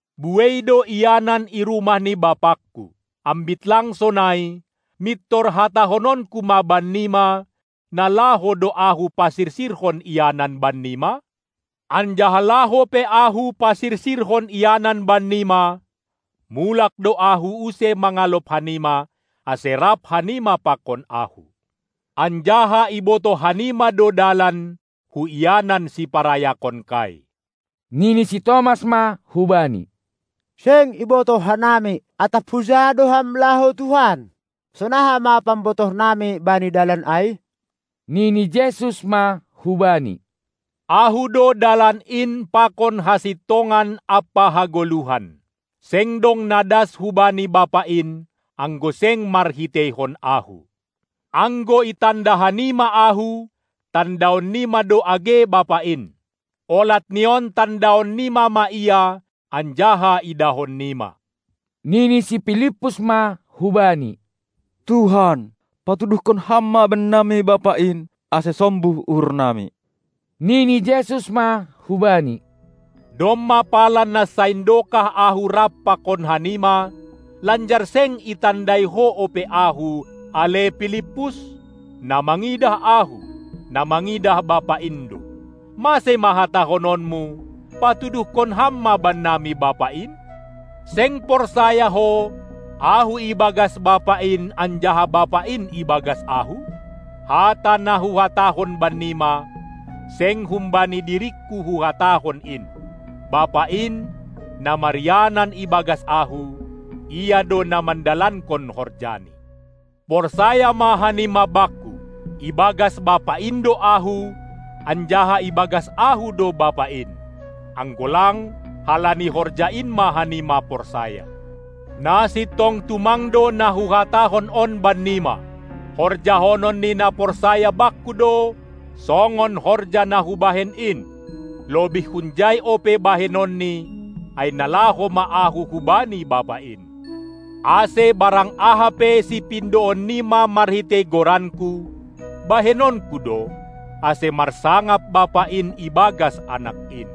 Buei do ianan i rumah ni BapaKu. Ambit lang sonai, mintor hatahononKu ma bannima, na laho do Ahu pasirsirhon ianan bannima? Anjaha laho pe Ahu pasirsirhon ianan bannima, mulak do Ahu, use mangalop hanima, ase rap hanima pakon Ahu. Anjaha ibotoh hanima do dalan hu ianan siparayakonKai. Nini si Tomas ma hu-Bani: Seng ibotoh hanami, atap huja do Ham laho Tuhan! Sonaha ma pambotoh nami bani dalan ai? Nini Jesus ma hubani: Ahu do dalan in pakon hasintongan ampa hagoluhan. Seng dong na das hubani Bapa in, anggo seng marhiteihon Ahu. Anggo itanda hanima Ahu, tandaonnima do age Bapa in. Olat ni on tandaon nima ma Ia anjaha idahon nima. Nini si Pilippus ma hu Bani: Tuhan, patuduhkon Ham ma bannami Bapa in, ase sombuh uhur nami! Nini Jesus ma hubani: Domma pala nasain dokah Ahu rap pakon hanima, lanjar seng itandai ho ope Ahu, ale Pilippus? Na mangidah Ahu, na mangidah Bapa in do. Mase ma hatahononmu: Patuduhkon Ham ma bannami Bapa in? Seng porsaya ho, Ahu ibagas Bapa in anjaha Bapa in ibagas Ahu? Hata na Huhatahon bannima, seng humbani diringKu Huhatahon in. Bapa in, na marianan ibagas Ahu, Ia do na mandalankon horjaNi. Porsaya ma hanima Bakku: Ibagas Bapa in do Ahu, anjaha ibagas Ahu do Bapa in. Anggo lang, halani horja in ma hanima porsaya! Na sintong tumang do na Huhatahon on bannima: Horjahonon ni na porsaya Bakku do songon horja na Hubahen in; lobih hunjai ope bahenonNi, ai na laho ma Ahu hubani Bapa in. Ase barang aha pe sipindoon nima marhitei goranKu, bahenonKu do, ase marsangap Bapa in ibagas Anak in.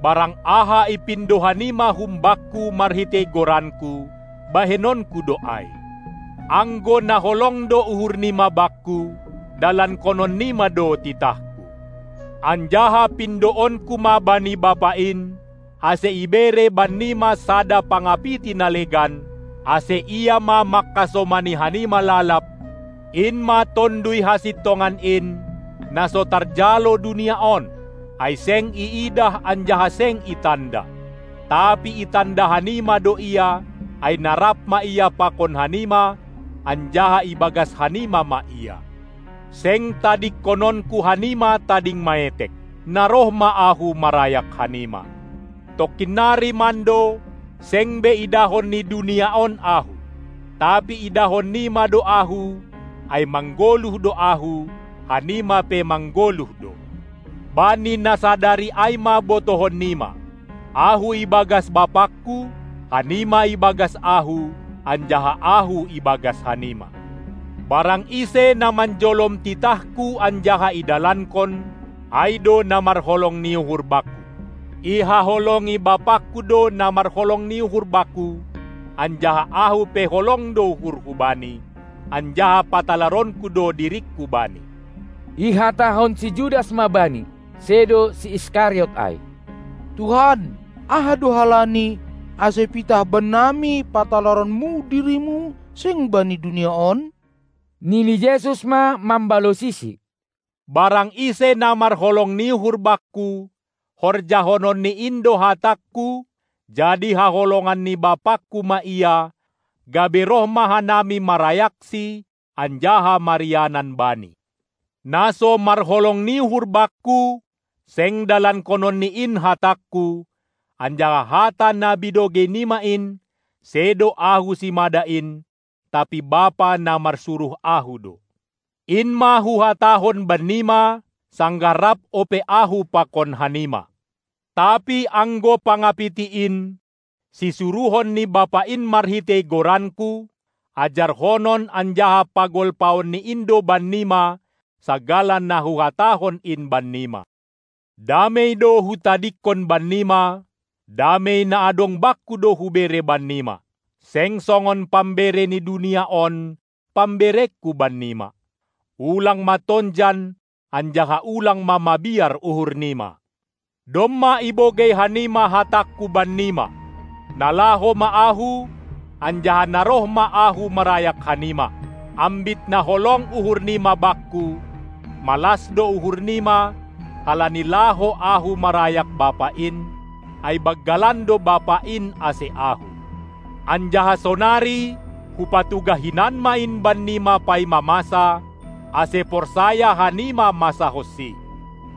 Barang aha ipindo hanima hum Bakku marhitei goranKu, bahenonKu do ai. Anggo na holong do uhur nima Bakku, dalankonon nima do titahKu. Anjaha pindoonKu ma bani Bapa in, ase ibere bannima sada Pangapiti na legan, ase Ia ma mangkasomani hanima lalab, in ma Tonduy hasintongan in, na so tarjalo dunia on, ai seng iidah anjaha seng itanda. Tapi itanda hanima do Ia, ai na rap ma Ia pakon hanima, anjaha ibagas hanima ma Ia. Seng tadingkononKu hanima tading maetek; na roh ma Ahu marayak hanima. Tongkin nari mando, seng be idahon ni dunia on Ahu, tapi idahon nima do Ahu, ai manggoluh do Ahu, hanima pe manggoluh do. Bani na sadari ai ma botohon nima. Ahu ibagas BapaKu, hanima ibagas Ahu anjaha Ahu ibagas hanima. Barang ise na manjolom titahKu anjaha idalankon, ai do na marholong ni uhur Bakku. Ihaholongi BapaKu do na marholong ni uhur Bakku, anjaha Ahu pe holong do uhurHu bani, anjaha patalaronKu do Diringku bani. Ihatahon si Judas ma Bani (sedo si Iskariot ai): Tuhan, aha do halani, ase pitah bannami patalaronMu diriMu, seng bani dunia on? Nini Jesus ma mambalosisi: Barang ise na marholong ni uhur Bakku, horjahononni in do hatangKu, jadi haholongan ni BapaKu ma ia, gabe roh ma hanami marayaksi, anjaha marianan bani. Na so marholong ni uhur Bakku, seng dalankononni in hatangKu, anjaha hata na binogei nima in, sedo Ahu simada in, tapi Bapa, na marsuruh Ahu do. In ma Huhatahon bennima, sanggah rap ope Ahu pakon hanima. Tapi anggo pangapiti in, sisuruhon ni Bapa in marhitei goranKu, ajarhonon anjaha pagolpaon ni In do bannima sagala na Huhatahon in bannima. Damei do Hutadingkon bannima, damei na adong Bakku do hubere bannima. Seng songon pambere ni dunia on pamberengKu bannima. Ulang ma tonjan anjaha ulang ma mabiar uhur nima. Domma ibogei hanima hatangKu bannima: Na laho ma Ahu, anjaha na roh ma Ahu marayak hanima. Ambit na holong uhur nima Bakku, malas do uhur nima halani laho Ahu marayak Bapa in, ai banggalan do Bapa in ase Ahu. Anjaha sonari Hupatugah hinan ma in bannima, paima masa, ase porsaya hanima masa honsi.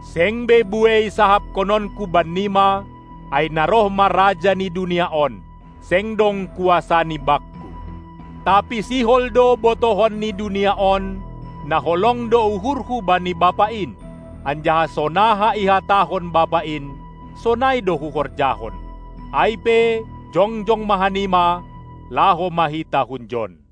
Seng be buei sahapkononKu bannima, ai na roh ma raja ni dunia on. Seng dong kuasani Bakku; tapi sihol do botohon ni dunia on, na holong do uhurHu bani Bapa in, anjaha sonaha ihatahon Bapa in, sonai do Huhorjahon. Ai pe jongjong ma hanima, laho ma hita hunjon!